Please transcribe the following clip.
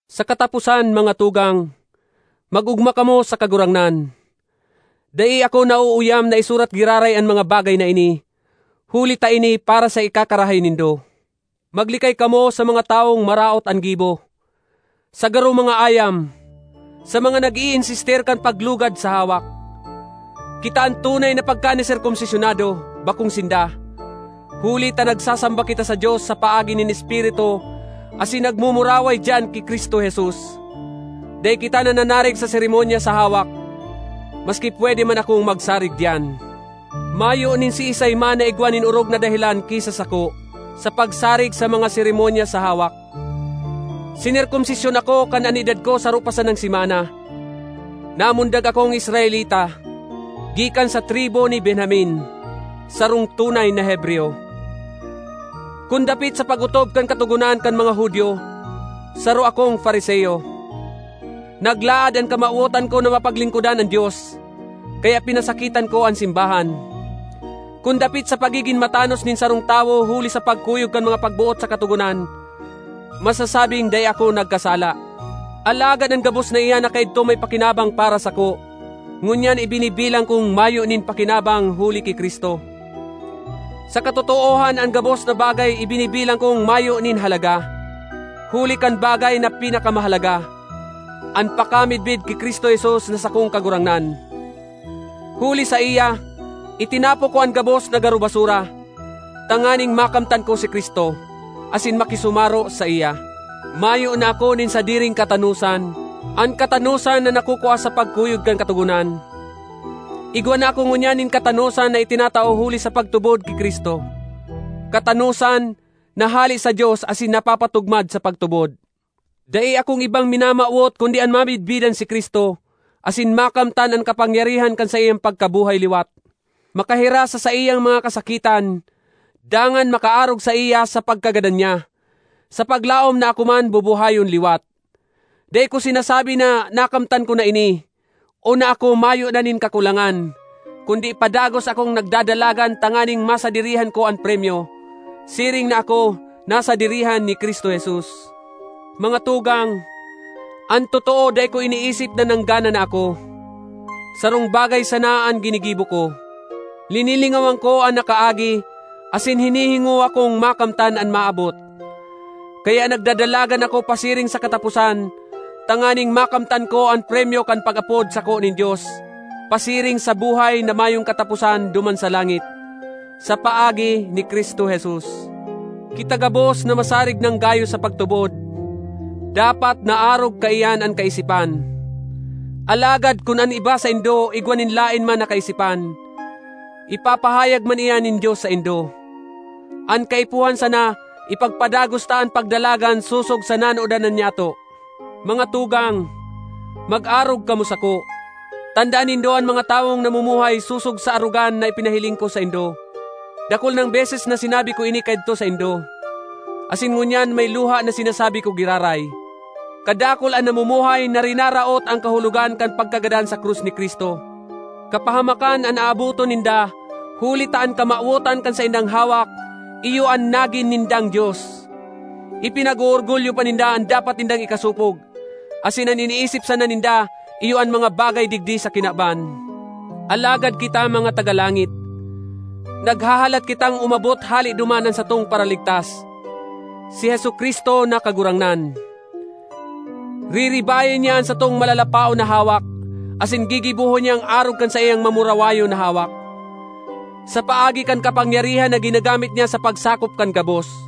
Sa kataposan, mga tugang, mag-ogma kamo sa Kagurangnan. Dai ako nauuyam na isurat giraray an mga bagay na ini, huli ta ini para sa ikakarahay nindo. Maglikay kamo sa mga tawong maraot an gibo, sa garo mga ayam, sa mga nag-iinsistir kan paglugad sa hawak. Kita an tunay na pagkaniserkomsisyonado, bakong sinda; huli ta nagsasamba kita sa Dios sa paagi nin Espiritu asin nagmumuraway diyan ki Cristo Jesus. Dai kita nananarig sa seremonya sa hawak, maski pwede man akong magsarig diyan. Mayo nin siisay man na igwa nin orog na dahelan ki sa sako sa pagsarig sa mga seremonya sa hawak. Sinerkomsisyon ako kan an edad ko saro pa sanang semana. Namundag akong Israelita, gikan sa tribu ni Benjamin, sarong tunay na Hebreyo. Kun dapit sa pag-otob kan Katogonan kan mga Judio, saro akong Fariseo. Naglaad an kamawotan ko na mapaglingkodan an Dios, kaya pinasakitan ko an simbahan. Kun dapit sa pagigin matanos nin sarong tawo huli sa pagkuyog kan mga pagboot sa Katogonan, masasabing dai ako nagkasala. Alagad an gabos na iyan na kaidto may pakinabang para sako, ngunyan ibinibilang kong mayo nin pakinabang huli ki Cristo. Sa katotoohan an gabos na bagay ibinibilang kong mayo nin halaga, huli kan bagay na pinakamahalaga—an pakamidbid ki Cristo Jesus na sakong Kagurangnan. Huli saiya itinapok ko an gabos na garo basura, tanganing makamtan ko si Cristo, asin makisumaro saiya. Mayo na ako nin sadiring katanosan, an katanosan na nakukua sa pagkuyog kan Katogonan. Igwa na ako ngunyan nin katanosan na itinatao huli sa pagtubod ki Cristo, katanosan na hale sa Dios asin napapatugmad sa pagtubod. Dai akong ibang minamawot kundi an mamidbidan si Cristo asin makamtan an kapangyarihan kan saiyang pagkabuhay liwat, makahiras sa saiyang mga kasakitan, dangan makaarog saiya sa pagkagadan niya, sa paglaom na ako man bubuhayon liwat. Dai ko sinasabi na nakamtan ko na ini, o na ako mayo na nin kakulangan; kundi padagos akong nagdadalagan tanganing masadirihan ko an premyo, siring na ako nasadirihan ni Cristo Jesus. Mga tugang, an totoo dai ko iniisip na nanggana na ako; sarong bagay sana an ginigibo ko: linilingawan ko an nakaagi asin hinihingowa kong makamtan an maabot. Kaya nagdadalagan ako pasiring sa kataposan tanganing makamtan ko an premyo kan pag-apod sako nin Dios pasiring sa buhay na mayong kataposan duman sa langit, sa paagi ni Cristo Jesus. Kita gabos na masarig nang gayo sa pagtubod, dapat na arog kaiyan an kaisipan. Alagad kun an iba saindo igwa nin laen man na kaisipan, ipapahayag man iyan nin Dios saindo. An kaipuhan sana ipagpadagos ta an pagdalagan sosog sa nanodan na nyato. Mga tugang, mag-arog kamo sako. Tandaan nindo an mga tawong namumuhay sosog sa arogan na ipinahiling ko saindo. Dakul nang beses na sinabi ko ini kaidto saindo, asin ngunyan may luha na sinasabi ko giraray: kadakul an namumuhay na rinaraot an kahulogan kan pagkagadan sa krus ni Cristo. Kapahamakan an aabotan ninda huli ta an kamawotan kan saindang hawak iyo an nagin nindang dios; ipinag-oorgulyo pa ninda an dapat nindang ikasopog, asin an iniisip sana ninda iyo an mga bagay digdi sa kinaban. Alagad kita mga taga langit; naghahalat kitang umabot hale duman an satong Paraligtas, si Jesu-Cristo na Kagurangnan. Riribayan niya an satong malalapaon na hawak, asin gigibohon niyang arog kan saiyang mamurawayon na hawak, sa paagi kan kapangyarihan na ginagamit niya sa pagsakop kan gabos.